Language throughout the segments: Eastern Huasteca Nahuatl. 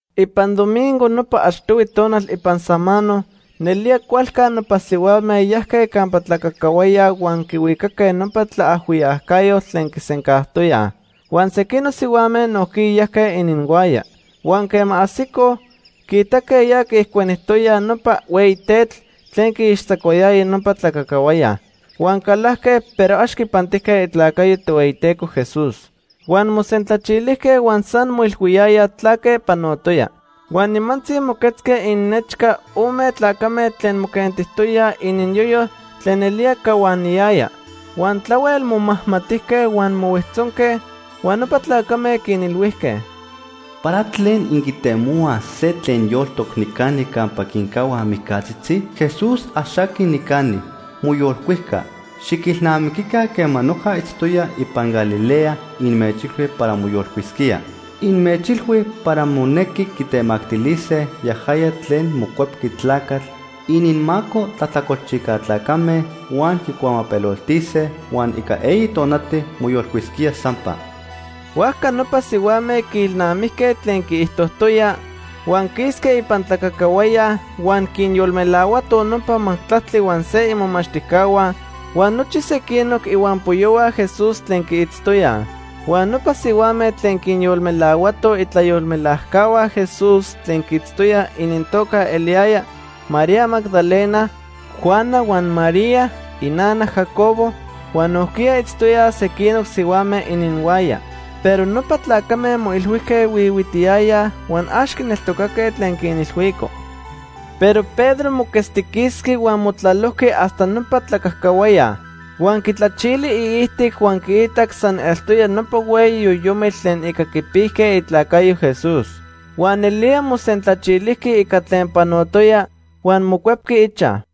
Ipan domingo, nopa achtohui tonal ipan samano, nelía cualca nopa sihuame yajque campa tlacacahuaya huan quihuicaque nopa tlaajhuiyacayotl tlen quisencajtoyaj. Huan sequinoc sihuame nojquiya yajque ininhuaya. Huan quema ajsicoj, quiitaque ya quiijcuenijtoyaj nopa hueyi tetl tlen quiixtzacuayaya nopa tlacacahuaya. Huan calajque, pero ax quipantijque itlacayo Tohueyiteco Jesús. Huan mosentlachilijque huan san moilhuiyayaj tlaque panotoya. Huan nimantzi moquetzque ininnechca ome tlacame tlen moquentijtoyaj ininyoyo tlen nelía cahuaniyaya. Huan tlahuel momajmatijque huan mohuijtzonque huan nopa tlacame quinilhuijque: ―¿Para tlen inquitemohuaj se tlen yoltoc nicani campa quincahuaj mijcatzitzi? Jesús ax aqui nicani. Moyolcuijca. Xiquilnamiquica quema noja itztoya ipan Galilea inmechilhui para moyolcuisquía. Inmechilhui para monequi quitemactilise yajaya tlen Mocuepqui Tlacatl ininmaco tlajtlacolchijca tlacame huan quicuamapeloltise huan ica eyi tonati moyolcuisquía sampa. Huajca nopa sihuame quiilnamijque tlen quiijtojtoya, huan quisque ipan tlacacahuaya huan quinyolmelahuatoj nopa majtlactli huan se imomachtijcahua huan nochi sequinoc ihuampoyohua Jesús tlen quiitztoyaj. Huan nopa sihuame tlen quinyolmelahuatoj itlayolmelajcahua Jesús tlen quiitztoyaj inintoca eliyaya María Magdalena, Juana huan María inana Jacobo huan nojquiya itztoyaj sequinoc sihuame ininhuaya. Pero nopa tlacame moilhuijque huihuitiyayaj huan ax quineltocaque tlen quinilhuicoj. Pero Pedro moquetztiquisqui huan motlalojqui hasta nopa tlacacahuaya. Huan quitlachili iijtic huan quiitac san eltoya nopa hueyi yoyomitl tlen ica quipijque itlacayo Jesús. Huan nelía mosentlachilijqui ica tlen panotoya, huan mocuepqui ichaj.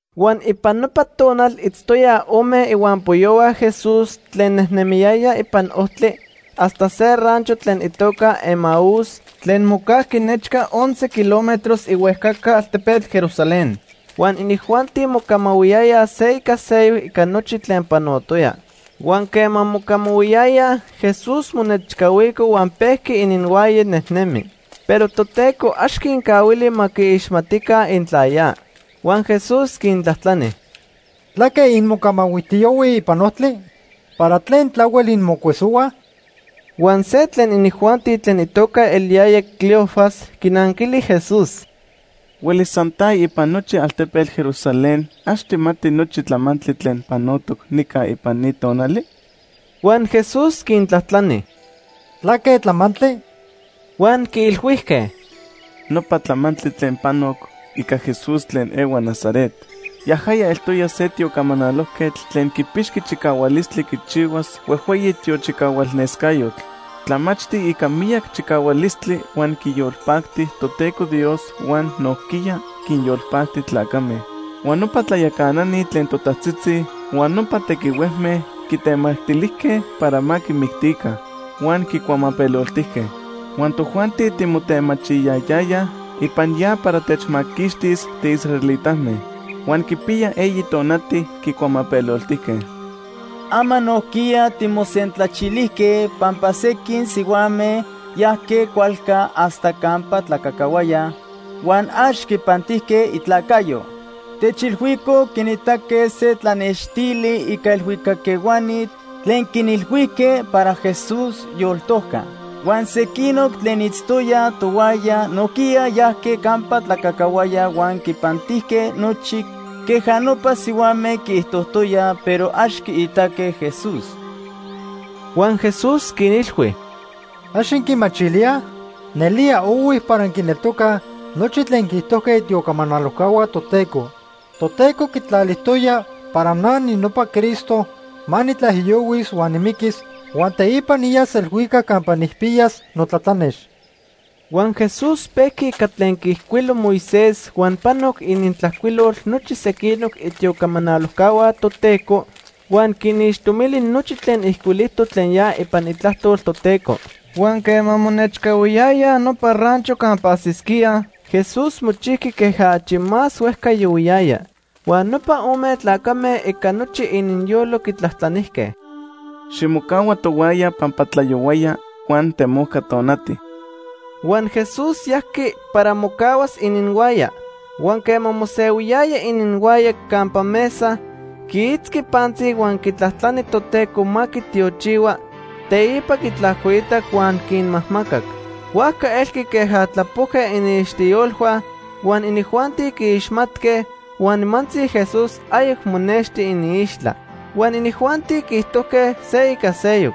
Huan ipan nopa tonal itztoyaj ome ihuampoyohua Jesús tlen nejnemiyayaj ipan ojtli hasta se rancho tlen itoca Emaús tlen mocajqui nechca once kilómetros ihuejcaca altepetl Jerusalén. Huan inijuanti mocamahuiyayaj se ica seyoc ica nochi tlen panotoya. Huan quema mocamahuiyayaj, Jesús monechcahuico huan pejqui ininhuaya nejnemi. Pero Toteco ax quincahuili ma quiixmatica intla ya. Huan Jesús quintlajtlani: ―¿Tlaque inmocamahuijtiyohuij ipan ojtli? ¿Para tlen tlahuel inmocuesohuaj? Huan se tlen inijuanti tlen itoca eliyaya Cleofas quinanquili Jesús: ―¿Huelis san ta ipan nochi altepetl Jerusalén ax tijmati nochi tlamantli tlen panotoc nica ipan ni tonali? Huan Jesús quintlajtlani: ―¿Tlaque tlamantli? Huan quiilhuijque: ―Nopa tlamantli tlen panoc ica Jesús tlen ehua Nazaret. Yajaya eltoya se tiocamanalojquetl tlen quipixqui chicahualistli quichihuas huejhueyi tiochicahualnescayotl. Tlamachti ica miyac chicahualistli huan quiyolpacti Toteco Dios huan nojquiya quinyolpacti tlacame. Huan nopa tlayacanani tlen totajtzitzi huan nopa tequihuejme quitemactilijque para ma quimictica. Huan quicuamapeloltijque. Huan tojuanti timotemachiyayayaj ipan ya para techmaquixtis tiisraelitame. Huan quipiya eyi tonati quicuamapeloltijque. Ama nojquiya timosentlachilijque pampa sequin sihuame yajque cualca hasta campa tlacacahuaya, huan ax quipantijque itlacayo. Techilhuicoj quinitaque se tlanextili ica elhuicac ehuani tlen quinilhuijque para Jesús yoltojca. Huan sequinoc tlen itztoyaj tohuaya nojquiya yajque campa tlacacahuaya huan quipantijque nochi queja nopa sihuame quiijtojtoyaj, pero ax quiitaque Jesús. Huan Jesús quinilhui: ―¿Ax inquimachilíaj? Nelía ohui para inquineltocaj nochi tlen quiijtojque itiocamanalojcahua Toteco. Toteco quitlalijtoya para na ninopa Cristo ma nitlaijiyohuis huan nimiquis huan teipa niyas elhuicac campa nijpiyas notlatlanex. Huan Jesús pejqui ica tlen quiijcuilo Moisés huan panoc inintlajcuilol nochi sequinoc itiocamanalojcahua Toteco, huan quinixtomili nochi tlen ijcuilijtoc tlen ya ipan Itlajtol Toteco. Huan quema monechcahuiyayaj nopa rancho campa ajsisquíaj, Jesús mochijqui queja achi más huejca yohuiyaya. Huan nopa ome tlacame ica nochi ininyolo quitlajtlanijque: ―Ximocahua tohuaya pampa tlayohuaya huan temojca tonati. Huan Jesús yajqui para mocahuas ininhuaya. Huan quema mosehuiyaya ininhuaya campa mesa, quiitzqui pantzi huan quitlajtlani Toteco ma quitiochihua, teipa quitlajcoitac huan quinmajmacac. Huajca elqui queja tlapojque iniixtiyolhua huan inijuanti quiixmatque, huan nimantzi Jesús ayoc monexti iniixtla. Huan inijuanti quiijtojque se ica seyoc: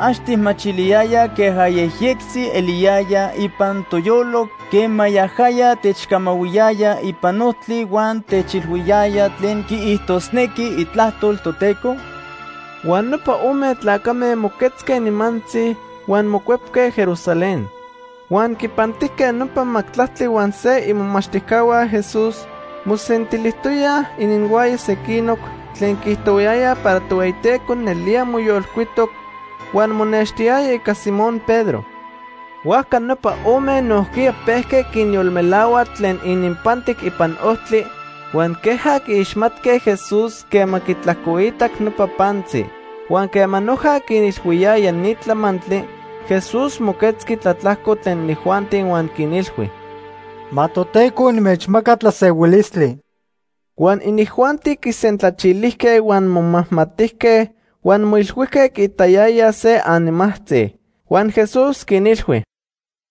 ―¿Ax tijmachiliyaya queja yejyectzi eliyaya ipan toyolo quema yajaya techcamahuiyaya ipan ojtli huan techilhuiyaya tlen quiijtosnequi Itlajtol Toteco? Huan nopa ome tlacame moquetzque nimantzi huan mocuepque Jerusalén. Huan quinpantijque nopa majtlactli huan se imomachtijcahua Jesús mosentilijtoyaj ininhuaya sequinoc tlen quiijtohuayayaj para Tohueyiteco nelía moyolcuitoc huan monextijtoya ica Simón Pedro. Huajca nopa ome nojquiya pejque quinyolmelahuaj tlen ininpantic ipan ojtli huan queja quiixmatque Jesús quema quitlajcoitac nopa pantzi. Huan quema noja quinilhuiyayaj ni tlamantli, Jesús moquetzqui tlatlajco tlen inijuanti huan quinilhui: ―Ma Toteco inmechmaca tlasehuilistli. Huan inijuanti quisentlachilijque huan momajmatijque huan moilhuijque quiitayayaj se animajtzi. Huan Jesús quinilhui: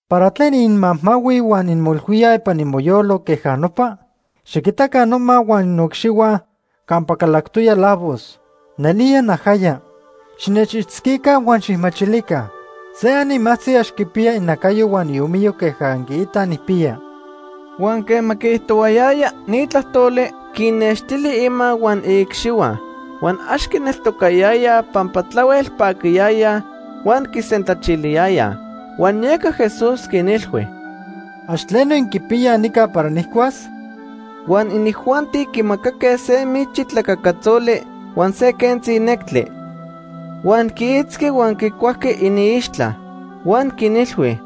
―¿Para tlen inmajmahuij huan inmoilhuíaj ipan imoyolo queja nopa? Xiquitaca noma huan noicxihua campa calactoya lavos. Nelía najaya. Xinechitzquica huan xijmachilica. Se animajtzi ax quipiya inacayo huan iomiyo queja inquiitaj nijpiya. Huan quema quiijtohuayaya ni tlajtoli, quinnextili ima huan iicxihua. Huan ax quineltocayayaj pampa tlahuel paquiyayaj huan quisentlachiliyayaj. Huan yeca Jesús quinilhui: ―¿Ax tleno inquipiyaj nica para nijcuas? Huan inijuanti quimacaque se michi tlacacatzoli huan se quentzi nectli. Huan quiitzqui huan quicuajqui iniixtla. Huan quinilhui: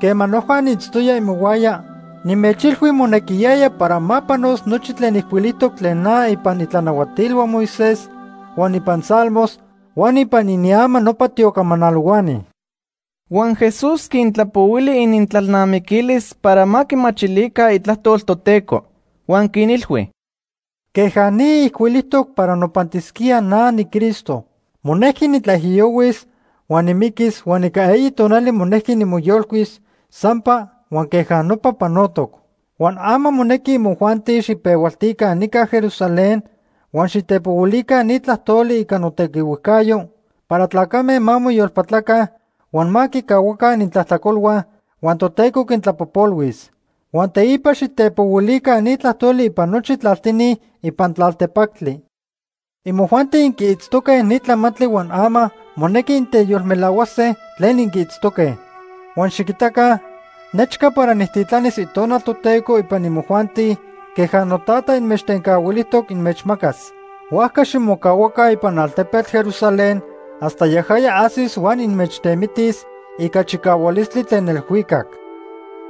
―Quema noja niitztoya imohuaya, nimechilhui monequiyaya para ma panos nochi tlen ijcuilijtoc tlen na ipan itlanahuatilhua Moisés, huan ipan Salmos, huan ipan iniama nopa tiocamanalohuani. Huan Jesús quintlapohuili inintlalnamiquilis para ma quimachilica Itlajtol Toteco. Huan quinilhui: ―Queja ni ijcuilijtoc para nopantisquía na niCristo. Monejqui nitlaijiyohuis huan nimiquis huan ica eyi tonali monejqui nimoyolcuis sampa huan queja nopa panotoc. Huan ama monequi imojuanti xijpehualtica nica Jerusalén huan xitepohuilica ni tlajtoli ica notequihuejcayo para tlacame ma moyolpatlaca huan ma quicahuaca inintlajtlacolhua huan Toteco quintlapojpolhuis. Huan teipa xitepohuilica ni tlajtoli ipan nochi tlaltini ipan tlaltepactli. Imojuanti inquiitztoque ni tlamantli huan ama monequi inteyolmelahuase tlen inquiitztoque. Huan xiquitaca, nechca para nijtitlanis Itonal Toteco ipan imojuanti queja noTata inmechtencahuilijtoc inmechmacas. Huajca ximocahuaca ipan altepetl Jerusalén hasta yajaya ajsis huan inmechtemitis ica chicahualistli tlen elhuicac.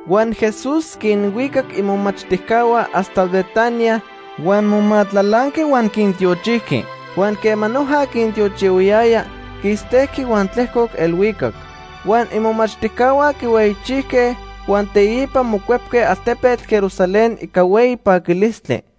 Huan Jesús quinhuicac imomachtijcahua hasta Betanía huan momatlalanqui huan quintiochijqui. Huan quema noja quintiochihuayaya, quistejqui huan tlejcoc elhuicac. Huan imomachtijcahua quihueyichijque huan teipa mocuepque altepetl Jerusalén ica hueyi paquilistli.